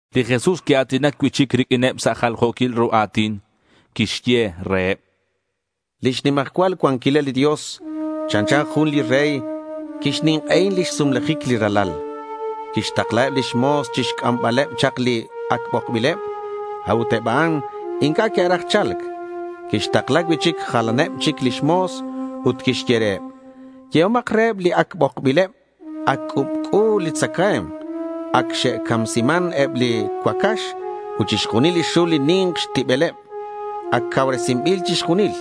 Li Jesús quia̱tinac cui'chic riq'uineb sa' jaljo̱quil ru a̱tin. Quixye reheb: Lix nimajcual cuanquilal li Dios chanchan jun li rey li quixnink'ei lix sumlajic li ralal. Quixtaklaheb lix mo̱s chixc'ambaleb chak li ac bokbileb. A'ut eb a'an inc'a' que'raj cha̱lc. Quixtakla cui'chic jalaneb chic lix mo̱s ut quixye reheb: —Yehomak reheb li ac bokbileb, “Ac c'ubc'u li tzacae̱mk, ac xe'camsiman eb li cuacax ut chixjunil li xul li ni̱nk xtibeleb. Ac cauresinbil chixjunil.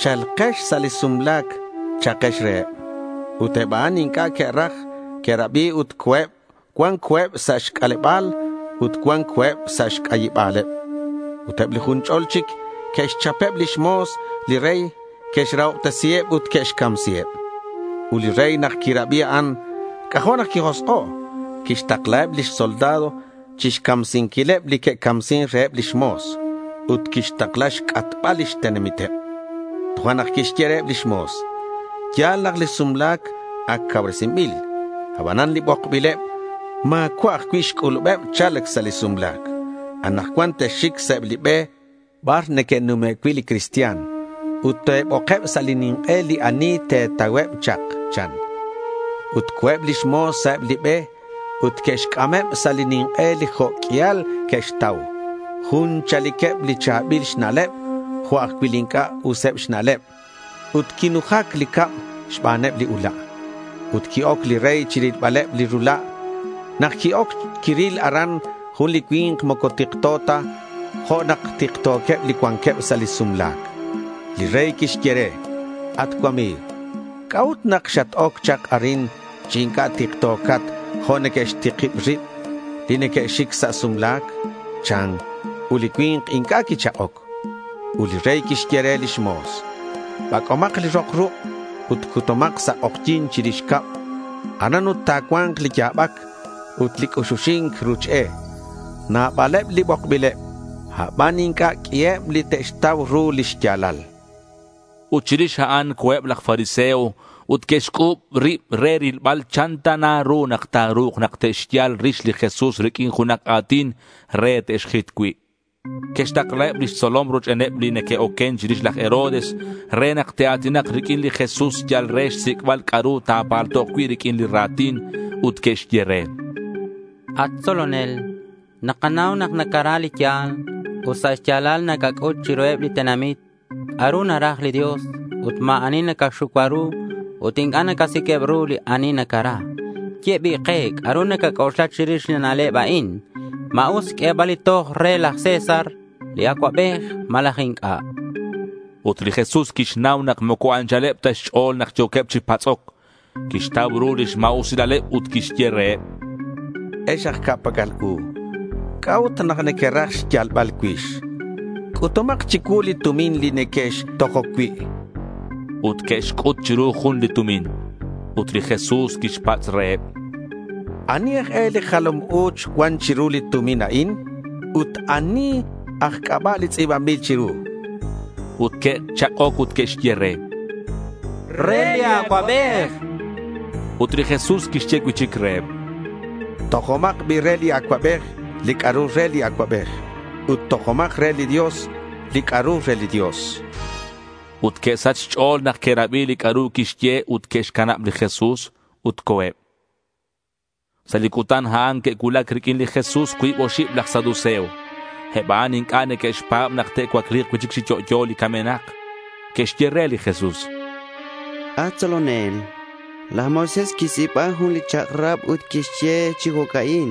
Cha̱lkex sa' li sumla̱c,” cha'akex reheb. Ut eb a'an inc'a' que'raj que'rabi ut co̱eb. Cuan co̱eb sa' xc'aleba̱l ut cuan co̱eb sa' xc'ayiba̱leb. Ut eb li jun ch'ol chic que'xchapeb lix mo̱s li rey, que'xrahobtesiheb ut que'xcamsiheb. Ut li rey nak quirabi a'an, c'ajo' nak quijosk'o'. Quixtaklaheb lix soldado chixcamsinquil li que'camsin reheb lix mo̱s. Ut quixtakla xc'atbal lix tenamiteb. Tojo'nak quixye reheb lix mo̱s: —Ya̱l nak li sumla̱c ac cauresinbil. Abanan li bokbileb ma̱cua' ajcui' xc'ulubeb cha̱lc sa' li sumla̱c. Anakcuan texxic sa' eb li be bar neque'nume' cui' li cristian. Ut te̱bokeb sa' li nink'e li ani te̱tauheb chak, chan. Ut co̱eb lix mo̱s sa' eb li be ut que'xc'ameb sa' li nink'e li jo' q'uial que'xtau, jun chaliqueb li cha̱bil xna'leb jo' ajcui' li inc'a' useb xna'leb. Ut quinujac li cab xbaneb li ula'. Ut qui-oc li rey chirilbaleb li rula'. Nak qui-oc, quiril aran jun li cui̱nk moco tikto ta jo' nak tikto̱queb li cuanqueb sa' li sumla̱c. Li rey quixye re: —At cuami̱g, ¿c'a'ut nak xat-oc chak arin chi inc'a' tikto̱cat jo' neque'xtikib rib li neque'xic sa' sumla̱c? chan. Ut li cui̱nk inc'a' quichak'oc. Ut li rey quixye reheb lix mo̱s: —Bac'omak li rok ruk' ut cutumak sa' k'ojyi̱n chirix cab. Aran ut ta̱cua̱nk li ya̱bac ut li c'uxuxi̱nc ruch e. Nabaleb li bokbileb aban inc'a' q'uiheb li te'xtau ru li xya̱lal. Ut chirix a'an, co̱eb laj fariseo ut que'xc'u̱b rib re rilbal chan ta na ru nak ta̱ru̱k nak te'xyal rix li Jesús riq'uin junak a̱tin re te'xjit cui'. Que'xtaklaheb lix tzolom rochbeneb li neque'oquen chirix laj Herodes re nak te'a̱tinak riq'uin li Jesús yal re xsic'bal c'a'ru ta̱paltok cui' riq'uin li ra̱tin. Ut que'xye re: —At tzolonel, nakanau nak nacara li ya̱l. Ut sa' xya̱lal nacac'ut chiruheb li tenamit c'a'ru naraj li Dios ut ma̱ ani nacaxucua ru ut inc'a' nacasiq'ueb ru li ani nacara. Ye bi' ke c'a'ru nacac'oxla chirix li na'leb a'in. ¿Ma us xq'uebal li toj re laj César li Acuabej malaj inc'a'? chanqueb. Ut li Jesús quixnau nak moco anchaleb ta xch'o̱l nak yo̱queb chi patz'oc. Quixtau ru lix ma̱usilaleb ut quixye reheb: —Ex aj ca'pac'al u, ¿c'a'ut nak nequeraj xyalbal cuix? C'utumak chicuu li tumin li nequextojoc cui', chan reheb. Ut que'xc'ut chiru jun li tumin. Ut li Jesús quixpatz' reheb: —¿Ani aj e li jalam u̱ch cuan chiru li tumin a'in? Ut, ¿ani aj c'aba' li tz'i̱banbil chiru? chan. Ut que'chak'oc ut que'xye re: —Re li Acuabej, chanqueb. Ut li Jesús quixye cui'chic reheb: —Tojomak bi' re li Acuabej li c'a'ru re li Acuabej, ut tojomak re li Dios li c'a'ru re li Dios, chan. Ut que'sach xch'o̱l nak que'rabi li c'a'ru quixye ut que'xcanab li Jesús ut co̱eb. Sa' li cutan a'an que'cuulac riq'uin li Jesús cuib oxib laj saduceo. Eb a'an inc'a' neque'xpa̱b nak te'cuacli̱k cui'chic chi yo'yo li camenak. Que'xye re li Jesús: —At tzolonel, laj Moisés quixtz'i̱ba jun li chak'rab ut quixye chi jo'ca'in: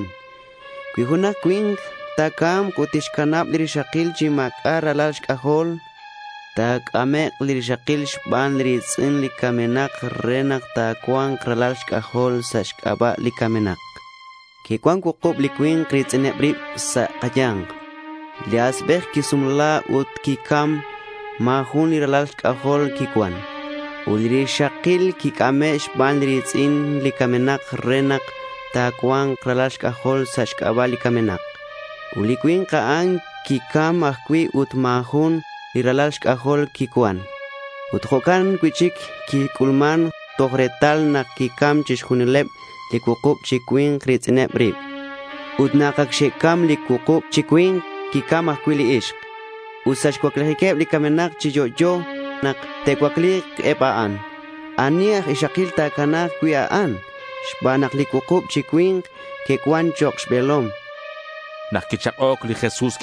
Cui junak cui̱nk ta̱ca̱mk ut tixcanab li rixakil chi ma̱c'a' ralal xc'ajol, ta̱c'amek' li rixakil xban li ri̱tz'in li camenak re nak ta̱cua̱nk ralal xc'ajol sa' xc'aba' li camenak. Que'cuan cuukub li cui̱nk ri̱tz'ineb rib sa' kaya̱nk. Li asbej quisumla ut nak quicam ma̱ jun li ralal xc'ajol quicuan. Ut li rixakil quic'ame' xban li ri̱tz'in li camenak re nak ta̱cua̱nk ralal xc'ajol sa' xc'aba' li camenak. Ut li cui̱nk a'an quicam ajcui' ut ma̱ jun li ralal xc'ajol quicuan. Ut jo'can cui'chic quic'ulman toj retal nak que'cam chixjunileb li cuukub chi cui̱nk ri̱tz'ineb rib. Ut nak ac xe'cam li cuukub chi cui̱nk, quicam ajcui' li ixk. Ut sa' xcuaclijiqueb li camenak chi yo'yo, nak te'cuacli̱k eb a'an, ¿ani aj ixakil ta̱cana̱k cui' li ixk a'an, xban nak li cuukub chi cui̱nk que'cuan chok' xbe̱lom? chanqueb re li Jesús.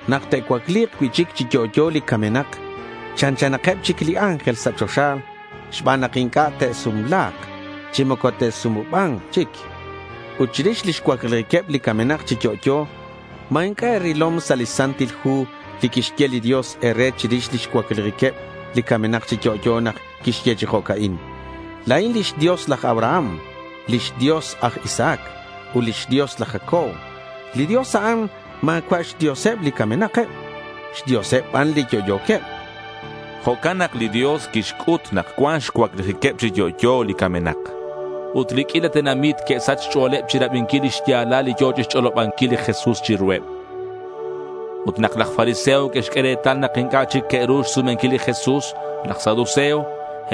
Nak te'cuacli̱k cui'chic chi yo'yo li camenak, chanchanakeb chic li ángel sa' choxa xban nak inc'a' te'sumla̱k chi moco te'sumuba̱nk chic. Ut chirix lix cuaclijiqueb li camenak chi yo'yo, ¿ma inc'a' e̱rilom sa' li Santil Hu li quixye li Dios e̱re chirix lix cuaclijiqueb li camenak chi yo'yo? Quixye chi jo'ca'in: La̱in lix Dios laj Abraham, lix Dios aj Isaac, ut lix Dios laj Jacob. Li Dios, a'an ma̱cua' xDioseb li camenakeb; xDioseb ban li yo'yo̱queb, chan li Jesús. (Jo'can nak li Dios quixc'ut nak cuan xcuaclijiqueb chi yo'yo li camenak.) Ut li q'uila tenamit que'sach xch'o̱leb chirabinquil li xya̱lal li yo̱ chixch'olobanquil li Jesús chiruheb. Ut nak laj fariseo que'xq'ue retal nak inc'a' chic que'ru xsumenquil li Jesús laj saduceo,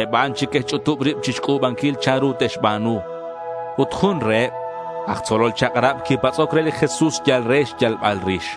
eb a'an chic que'xch'utub ribeb chixc'u̱banquil chanru te'xba̱nu. Ut jun reheb, aj tzolol chak'rab, quipatz'oc re li Jesús yal re xyalbal rix.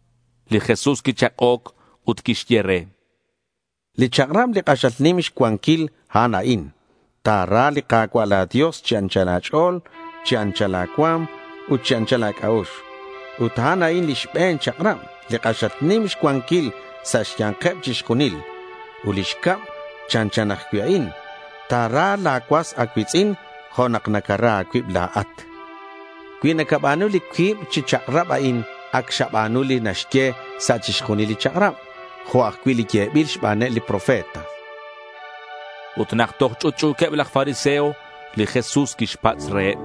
Li Jesús quichak'oc ut quixye re: —Li chak'rab li k'axal nim xcuanquil, a'an a'in: Ta̱ra li Ka̱cua' la̱ Dios chi anchal a̱ch'o̱l ut chi anchal la̱ cua̱m ut chi anchal la̱ c'a'ux. A'an a'in li xbe̱n chak'rab, li k'axal nim xcuanquil sa' xya̱nkeb chixjunil. Ut li xcab, chanchan ajcui' a'in: Ta̱ra la̱ cuas a̱cui̱tz'in jo' nak nacara a̱cuib la̱at. Cui nacaba̱nu li cuib chi chak'rab a'in ac xaba̱nu li naxye sa' chixjunil li chak'rab jo' ajcui' li yebil xbaneb li profeta, chan li Jesús. Ut nak toj ch'utch'u̱queb laj fariseo, li Jesús quixpatz' reheb: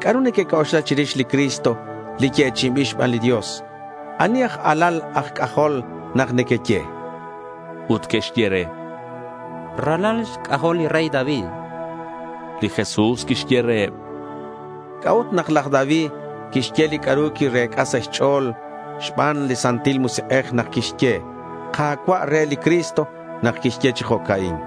—¿C'a'ru nequec'oxla chirix li Cristo, li yechi'inbil xban li Dios? ¿Ani aj alal aj c'ajol nak nequeye?— Ut que'xye re: —Ralal xc'ajol li rey David.— Li Jesús quixye reheb: —¿C'a'ut nak laj David quixye li c'a'ru quirec'a sa' xch'o̱l xban li Santil Musik'ej nak quixye “Ka̱cua'” re li Cristo? Quixye chi jo'ca'in: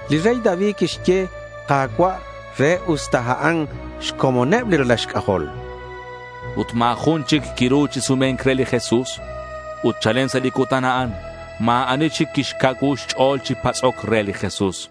Li rey David quixye “Ka̱cua'” re, usta a'an xcomoneb li ralal xc'ajol.— Ut ma̱ jun chic quiru chi sume̱nc re li Jesús. Ut chalen sa' li cutan a'an, ma̱ ani chic quixcacuu xch'o̱l chi patz'oc re li Jesús.